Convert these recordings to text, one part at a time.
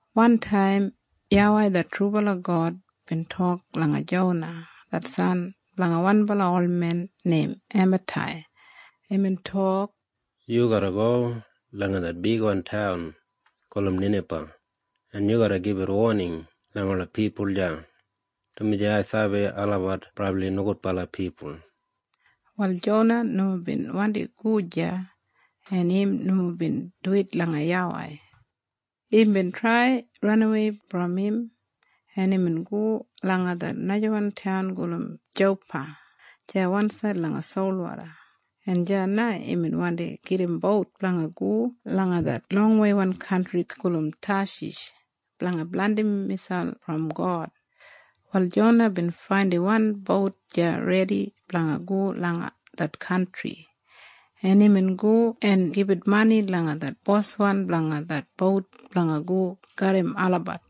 Wantaim YAWEI det trubala God bin tok langa Jona det san blanga wan olmen neim Ematai. Imbin tok, “Yu garra go langa det bigwan taun gulum Ninaba, en yu garra gibit woning langa ola pipul deya, dumaji ai sabi olabat brabli nogudbala pipul.” Wal Jona nomo bin wandi go deya, en im nomo bin duwit langa YAWEI. Imbin trai ranawei brom im, en imbin go langa det najawan taun gulum Jopa deya wansaid langa solwoda, en deya na imbin wandi gedim bout blanga go langa det longweiwan kantri gulum Tashish blanga blandim miselp brom God. Wal Jona bin faindim wan bout deya redi blanga go langa det kantri, en imbin go en gibit mani langa det boswan blanga det bout blanga go garram olabat.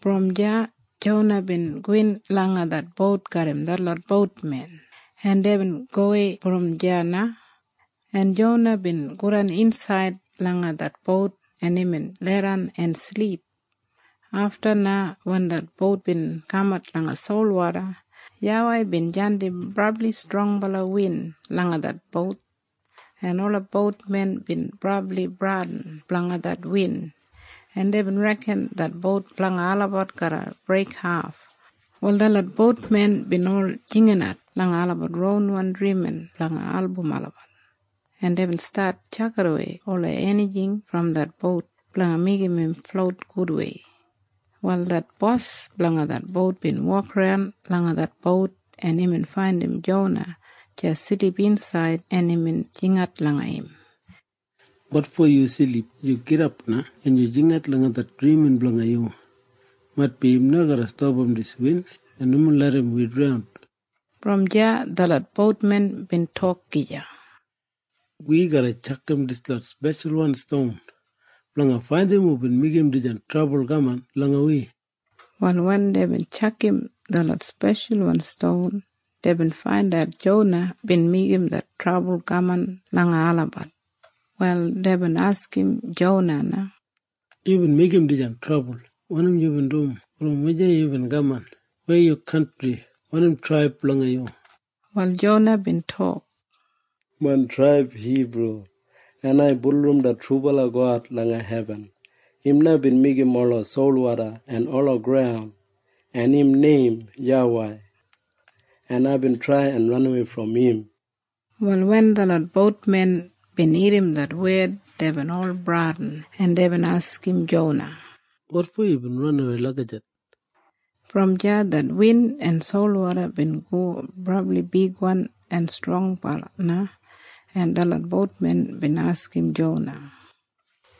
Brom deya Jona bin gowin langa det bout garram detlot boutmen, en deibin gowei brom deya na, en Jona bin godan insaid langa det bout, en imbin leidan en silip. Afta na wen det bout bin kamat langa solwoda, YAWEI bin jandim brabli strongbala win langa det bout, en ola boutmen bin brabli bradin blanga det win, en deibin reken det bout blanga olabat garra breikhaf. Wal detlot boutmen bin ol jinginat langa olabat ronwan drimin blanga album olabat, en deibin stat tjakidawei ola enijing brom det bout blanga meigim im flout gudwei. Wal det bos blanga det bout bin wokaran langa det bout, en imbin faindim Jona deya silip insaid, en imbin jingat langa im, “Wotfo yu silip? Yu gidap na, en yu jingat langa det drimin blanga yu. Maitbi im garra stapam dis win en nomo larram wi draun.” Brom deya detlot boutmen bin tok gija, “Wi garra tjakam detlot speshalwan ston blanga faindat hubin meigim dijan trabul kaman langa wi.” Wal wen deibin tjakam detlot speshalwan ston, deibin faindat Jona bin meigim det trabul kaman langa olabat. Wal deibin askim Jona na, “Yubin meigim dis trabul? Wanim yubin dum? Brom wujei yubin kaman? Weya yu kantri? Wanim traib blanga yu?” Wal Jona bin tok, “Main traib Hibru, en ai bulurrum det trubala God langa hebin. Im na bin meigim ola solwoda en ola graun, en im neim YAWEI. En aibin trai ranawei brom im.” Wal wen detlot boutmen bin irrim det wed, deibin ol bradin, en deibin askim Jona, “Wotfo yubin ranawei lagijat?” Brom deya det win en solwoda bin go brabli bigwan en strongbala na, en detlot boutmen bin askim Jona,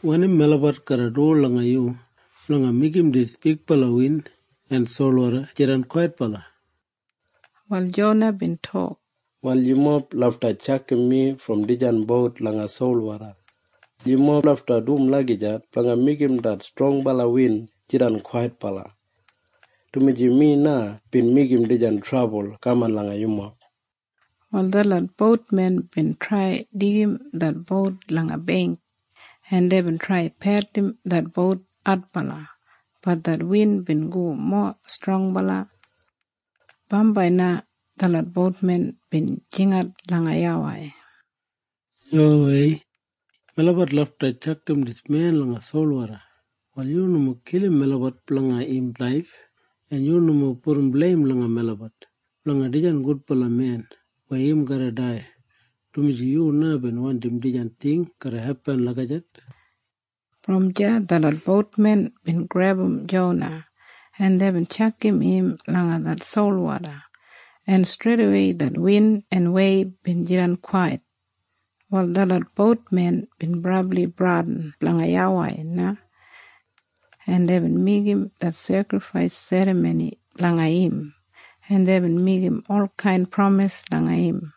“Wanim melabat garra du langa yu blanga meigim dis bigbala win en solwoda jidan kwaitbala?” Wal Jona bin tok, “Wal yumob lafta tjakam mi brom dijan bout langa solwoda. Yumob lafta dum lagijat blanga meigim det strongbala win jidan kwaitbala, dumaji mi na bin meigim dijan trabul kaman langa yumob.” Wal detlot boutmen bin trai deigim det bout langa beingk, en deibin trai pedulum det bout adbala. Bat det win bin go mowa strongbala. Bambai na detlot boutmen bin jingat langa YAWEI. Deibin jingat, “YAWEI, melabat lafta tjakam dis men langa solwoda. Wal yu nomo kilim melabat blanga im laif, en yu nomo pudum bleim langa melabat blanga dijan gudbala men weya im garra dai, dumaji yu na bin wandim dijan ting garra hepin lagijat.” Brom deya detlot boutmen bin grebum Jona, en deibin tjakam im langa det solwoda, en streidawei det win en weib bin jidan kwait. Wal detlot boutmen bin brabli bradin blanga YAWEI na, en deibin meigim det sekrifais serramoni blanga im, en deibin meigim olkain pramis langa im.